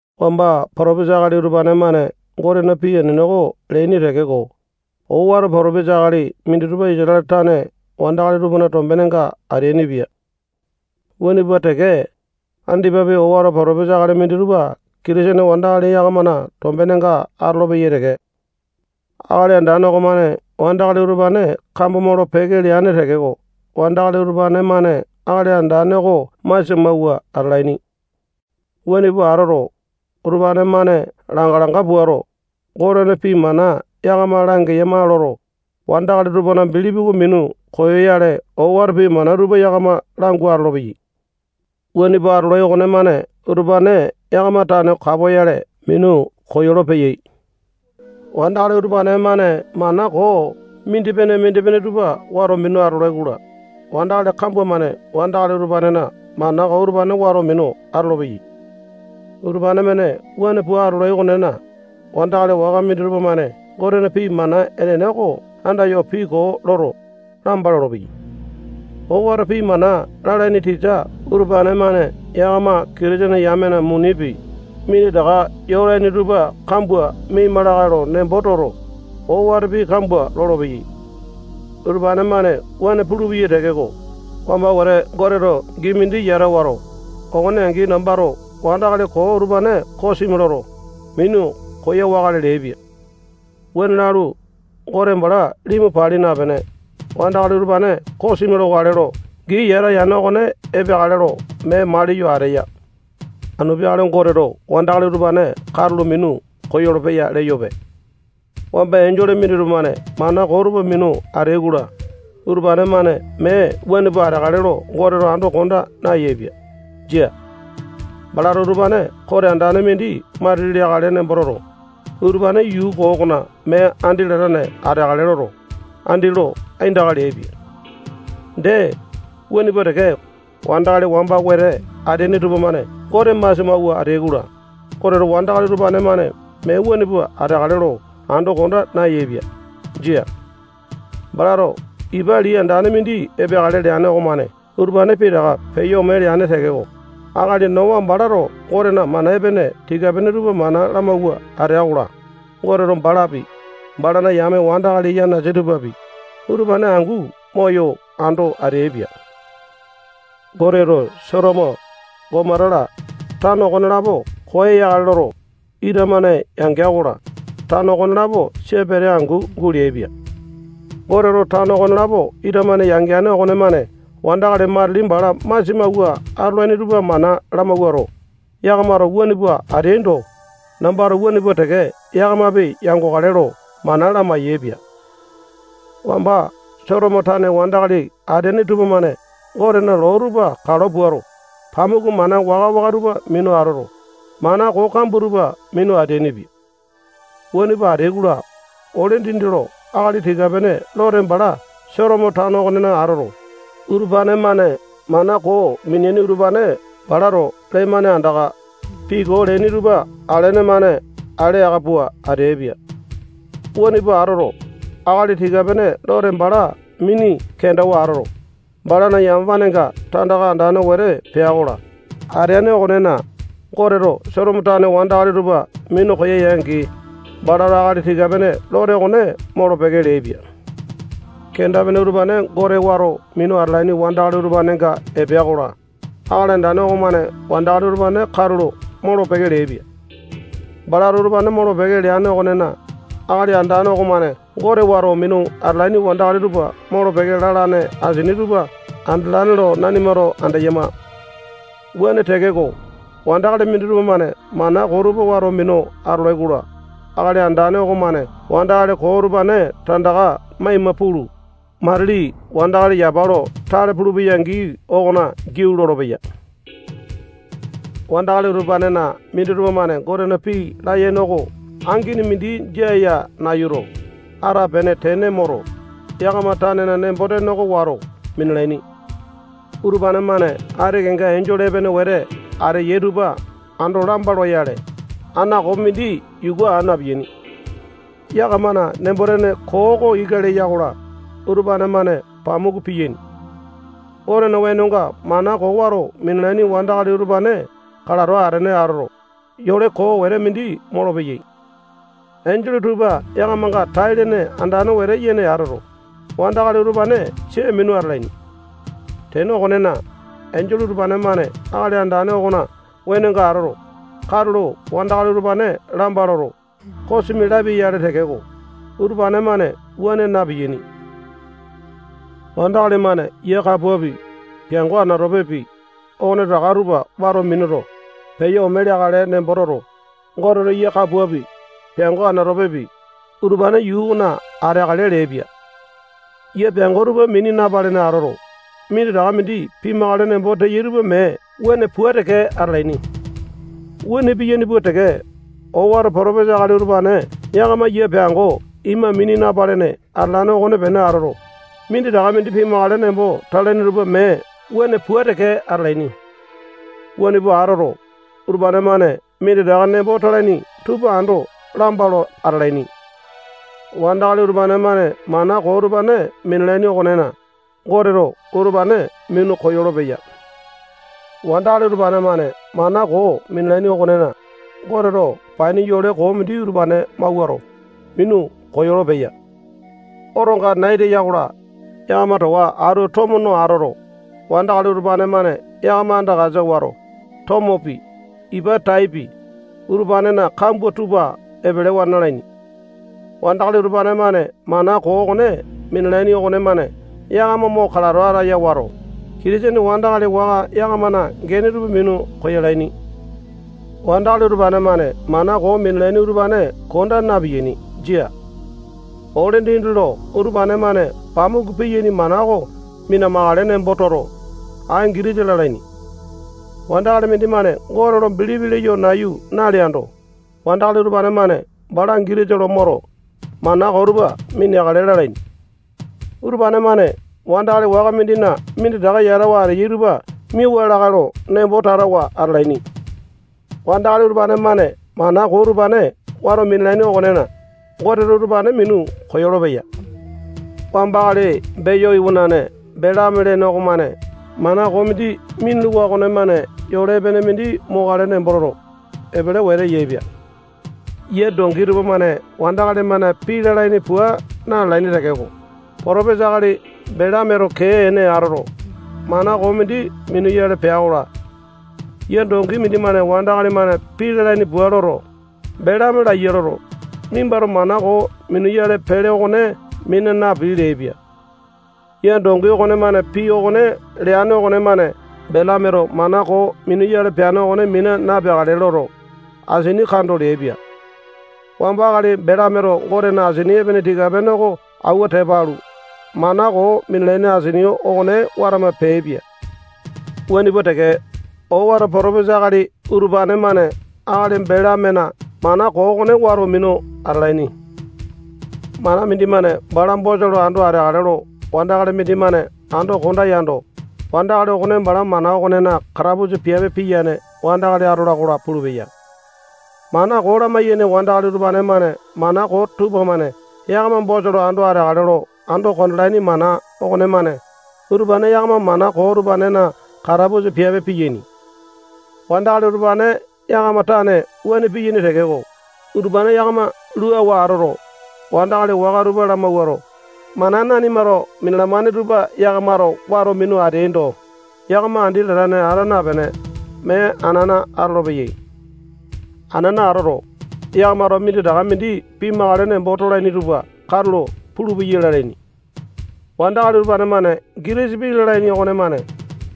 Wamba potopesa akali utupane-mane Gotena pii enene oko leaini tekeko, owato potopesa akali minditupa Isatale tane wandakali tupana tombenenga ateainipia. Wuane pua teke, andipapi owato potopesa akali minditupa Kitisene wandakali yakamana tombenga atolopeyai teke. Akali Andane okomane wandakali utupane kambo molo-peke leane tekeko, wandakali utupane-mane Akali Andane oko masia mawua atalaini. Wuane pua atoto, utupane-mane langa-langa puato, Gotena pii mana yakama langeyama loto, wandakali tupana bilipi oko minu koyoyale owato pii mana tupa yakama langu atolopeyai. Wuane pua atolai okonemane utupane yakama tane kapoyale minu koyolo-peyai. Wandakali utupane-mane mana koo mindipene-mindipene tupa wato minu atolai-kola, wandakali kambua-mane wandakali utupanena mana koo utupane wato minu atolopeyai. Utupane-mane wuane pua atolai okonena, wandakali waka minditupa-mane Gotena pii mana enene oko andayo pii koo loto, lamba lolopeyai. Owato pii mana lalaini tisa utupane-mane yakama Kitisene yamena munipi, minditaka yolaini tupa kambua miaima lakae lo nembo toto, owato pii kambua lolopeyai. Utupane-mane wuane pulupeyai tekeko, wamba wete Goteto gii mindi yata wato, okone angi nambato wandakali koo utupane kosimi loto, minu koyawakale leaipia. Wuane lalu, Gote bala limu pali napene, wandakali utupane kosimi lokale lo gii yata yane okone epeakale lo mee maliyo ateya. Anu peakale Goteto wandakali utupane katulo minu koyolo-peya leyope. Wamba enjole minditupa-mane mana koo tupa minu ateai-kola, utupane-mane mee wuane pua ateakale lo Goteto ando konda nayaepia. Jia. Balato utupane kote andane mindi matili leakale nembo toto, utupane yuu koo okona mee andi latane ateakale loto, andi lo aindaka leaipia. Dee, wuane pua teke, wandakali wamba wete ateaini tupamane Gote masia mawua ateai-kola, Goteto wandakali utupane-mane mee wuane pua ateakale lo ando konda nayaepia. Jia. Balato ipa lii andane mindi epeakale leane okomane utupane pitaka peyo ome leane tekeko, akali Nowa balato Gotena mana epene tika-pene tupa mana lamawua atea-kola, Goteto balapi, balana yame wandakali yanasa tupapi, utupane angu moyo ando ateaipia. Goteto Sotomo, Gomota-la, tano okonelapo koya yakale loto, ita-mane yangea-kola, tano okonelapo sia pete angu guleaipia. Goteto tano okonelapo ita-mane yangeane okonemane wandakali matili bala masia mawua atolaini tupa mana lamawuato, yakamato wuane pua ateaindo, nambato wuane pua teke yakamapi yangokale lo mana lamai-yaepia. Wamba Sotomo tane wandakali ateaini tupamane Gotena loo tupa kalo puato, pamuku mana waka-waka tupa minu atoto, mana koo kambua tupa minu ateainipia. Wuane pua ateai-kola, ole dindi lo akali tika-pene Lote bala Sotomo tano okonena atoto, utupane-mane mana koo miniaini utupane balato lee-mane andaka, pii koo leaini tupa alene-mane ale aka pua ateaipia. Wuane pua atoto, akali tika-pene Lote bala mini kendawa atoto, balana yamapanenga tandaka andane wete pea-kola, ateane okonena, Goteto Sotomo tane wandakali tupa minu koya-angi, balato akali tika-pene Lote okone molo-peke leaipia. Kenda-pene utupane Gote wato minu atalaini wandakali utupanenga epea-kola, Akali Andane okomane wandakali utupane katulo molo-peke leaipia. Balato utupane molo-peke leane okonena, Akali Andane okomane Gote wato minu atalaini wandakali tupa molo-peke lalane asini tupa andalane lo nanimato andeyama. Wuane tekeko, wandakali minditupa-mane mana koo tupa wato minu atolai-kola, Akali Andane okomane wandakali koo utupane tandaka maima pulu, matili wandakali yapa lo tale pulupeya gii okona giau lolopeya. Wandakali utupanena minditupa-mane Gotena pii layene oko angini mindi jia ya nayuto, atapene tene moto, yakama tanena nembo-tene oko wato minalaini. Utupane-mane ati kenga enjole epene wete ateyai tupa ando lamba loyale, aŋakopi mindi yuku aa na-piyaini. Yakamana nembo-tene koo oko ika leya-kola, utupane-mane pamuku piyaini. Gotena wenonga mana koo wato minalaini wandakali utupane kalato atene atoto, yole koo wete mindi molopeyai. Enjole tupa yakamanga tai-lene andane wete yene atoto, wandakali utupane sia minu atalaini. Tene okonena, enjole utupane-mane Akali Andane okona wenonga atoto, katulo wandakali utupane lamba loto, kosimi lapia-yale tekeko, utupane-mane wuane na-piyaini. Wandakali-mane yia kapuapi, peango anatopepi, okonetaka tupa wato minuto, peyo ome leakale nembo toto, Goteto yia kapuapi, peango anatopepi, utupane yuu okona ateakale leaipia. Yia peango tupa mini napalene atoto, minditaka mindi pimakale nembo teyai tupa mee wuane pua teke atalaini. Wuane piyaini pua teke, owato potopesa akali utupane yakama yia peango ima mini napalene atalane okonepene atoto, minditaka mindi pimakale nembo talaini tupa mee wuane pua teke atalaini. Wuane pua atoto, utupane-mane minditaka nembo natalaini tupa ando lamba lo atalaini. Wandakali utupane-mane mana koo utupane minalaini okonena, Goteto utupane minu koyolo-peya. Wandakali utupane-mane mana koo minalaini okonena, Goteto paini yole koo mindi utupane mawuato, minu koyolo-peya. Otonga nai teya-kola, yakama towa atu tomo no atoto, wandakali utupane-mane yakama andakasa wato, tomopi, ipa taipi, utupanena kambua tupa epelewa nalaini. Wandakali utupane-mane mana koo okone minalaini okonemane yakama mo kalato ataya wato, Kitisene wandakali waka yakamana gene tupa minu koyalaini. Wandakali utupane-mane mana koo minalaini utupane konda na-piyaini. Jia. Ole dindi lo utupane-mane pamuku piyaini mana oko mina-makale nembo toto, ai gitisa lalaini. Wandakali mindimane Gote lo bilipi leyo nayu naleando, wandakali utupane-mane bala gitisa lo moto, mana koo tupa mineakale lalaini. Utupane-mane wandakali waka mindina minditaka yatawa ateyai tupa miauwa lakae lo nembo tatawa atalaini. Wandakali utupane-mane mana koo utupane wato minalaini okonena, Goteto utupane minu koyolo-peya. Wamba akali Beyo iwanane Belame lene okomane mana koo mindi minuluwa okonemane yole epene mindi mokale nembo toto, epele wete yaepia. Yia dongi tupamane wandakali-mane pii lalaini pua na-lalaini tekeko, potopesa akali Belameto kee ene atoto, mana koo mindi minuyale pea-kola, yia dongi mindimane wandakali-mane pii lalaini pua loto, Belame laiya loto, nimbato mana koo minuyale pele okone mina napii leaipia. Yia dongi okonemane pii okone leane okonemane Belameto mana koo minuyale peane okone mina napeakale loto, asini kando leaipia. Wamba akali Belameto Gotena asini epene tika-pene oko awua tepa alu, mana koo minalaini asini okone watama peaipia. Wuane pua teke, owato potopesa akali utupane-mane akali Belamena mana koo okone wato minu atalaini. Mana mindimane bala bosa lo ando ateakale lo wandakali mindimane ando konda yando, wandakali okone bala mana okonena katapusa piape piyane wandakali atola-kola pulupeya. Mana koo lamayaini wandakali utupane-mane mana koo tupamane yakama bosa lo ando ateakale lo ando kondalaini mana okonemane, utupane yakama mana koo utupanena katapusa piape piyaini. Wandakali utupane yakama tane wuane piyaini tekeko, utupane yakama luawa atoto, wandakali waka tupa lamawuato, mana nanimato minalamane tupa yakamato wato minu ateaindo, yakama andi latane ata napene, mee anana atolopeyai. Anana atoto, yakamato minditaka mindi pimakale nembo tolaini tupa katulo pulupeyai lalaini. Wandakali utupane-mane gitisa pii lalaini okonemane,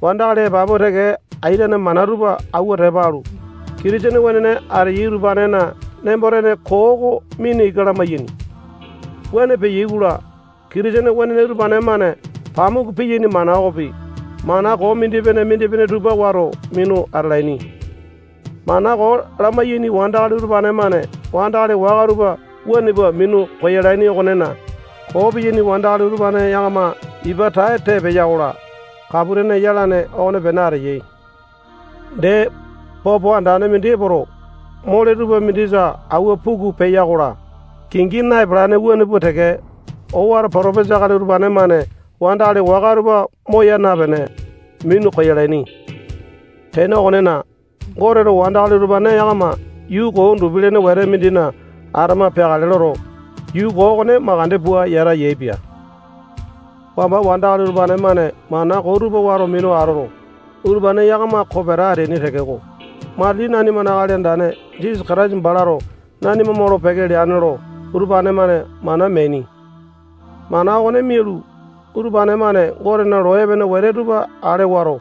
wandakali epapu teke aitene mana tupa awua tepa alu, Kitisene wenene ateyai utupanena nembo-tene koo oko mina ika lamayaini. Wuane peyai-kola, Kitisene wenene utupane-mane pamuku piyaini mana okopi, mana koo mindipene-mindipene tupa wato minu atalaini. Mana koo lamayaini wandakali utupane-mane wandakali waka tupa wuane pua minu koyalaini okonena, koo piyaini wandakali utupane yakama ipa tae tee peya-kola, kapu-tene yalane okonepene ateyai. Dee, popo andane mindi epoto, mole tupa mindisa awua puku peya-kola, kingi na-epalane wuane pua teke, owato potopesa akali utupane-mane wandakali waka tupa moya napene, minu koyalaini. Tene okonena, Goteto wandakali utupane yakama yuu koo undupi-lene wete mindina atama peakale loto, yuu koo okone makande pua yata yaepia. Wamba wandakali utupane-mane mana koo tupa wato minu atoto, utupane yakama kopeta ateaini tekeko, matili nanimana Akali Andane Jisasa Kataisa balato nanima molo-peke leane lo utupane-mane mana meaini. Mana okone mialu, utupane-mane Gotena loo epene wete tupa ale wato,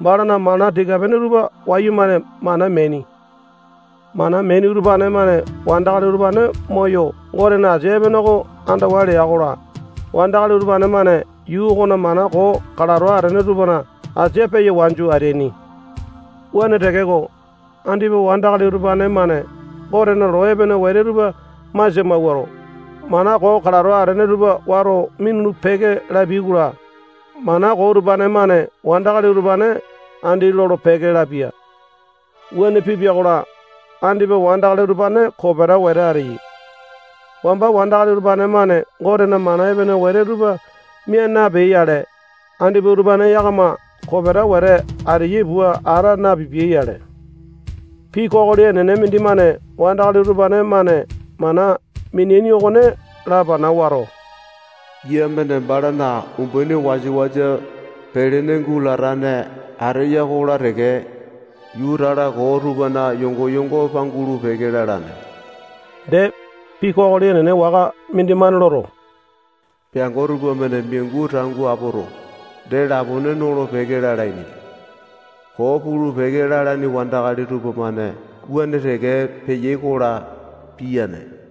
balana mana tika-pene tupa wayumane mana meaini. Mana meaini utupane-mane wandakali utupane moyo Gotena asia epene oko andawa lea-kola, wandakali utupane-mane yuu okona mana koo kalato atene tupana asia peya wanju ateaini. Wuane tekeko, andipa wandakali utupane-mane Gotena loo epene wete tupa masia mawuato, mana koo kalato atene tupa wato minulu-peke lapiai-kola, mana koo utupane-mane wandakali utupane andi lolo-peke lapia. Wuane pipia-kola, andipa wandakali utupane kopeta wete ateyai. Wamba wandakali utupane-mane Gotena mana epene wete tupa mia napeai-yale, andipa utupane yakama kopeta wete ateyai pua ata napipiai-yale. Pii kokoli enene mindimane wandakali utupane-mane mana mineaini okone lapana wato, yia-mane balana umbaini wasa-wasa pelene gulatane ateya-kola teke, yuu tala koo tupana yongo-yongo pangulu-peke lalane. Dee, pii kokoli enene waka mindimane loto, peango tupamane miangu tangu apoto, dee lapone nolo-peke lalaini. Koo pulu-peke lalaini wandakali tupamane wuane teke peyai-kola, piyane.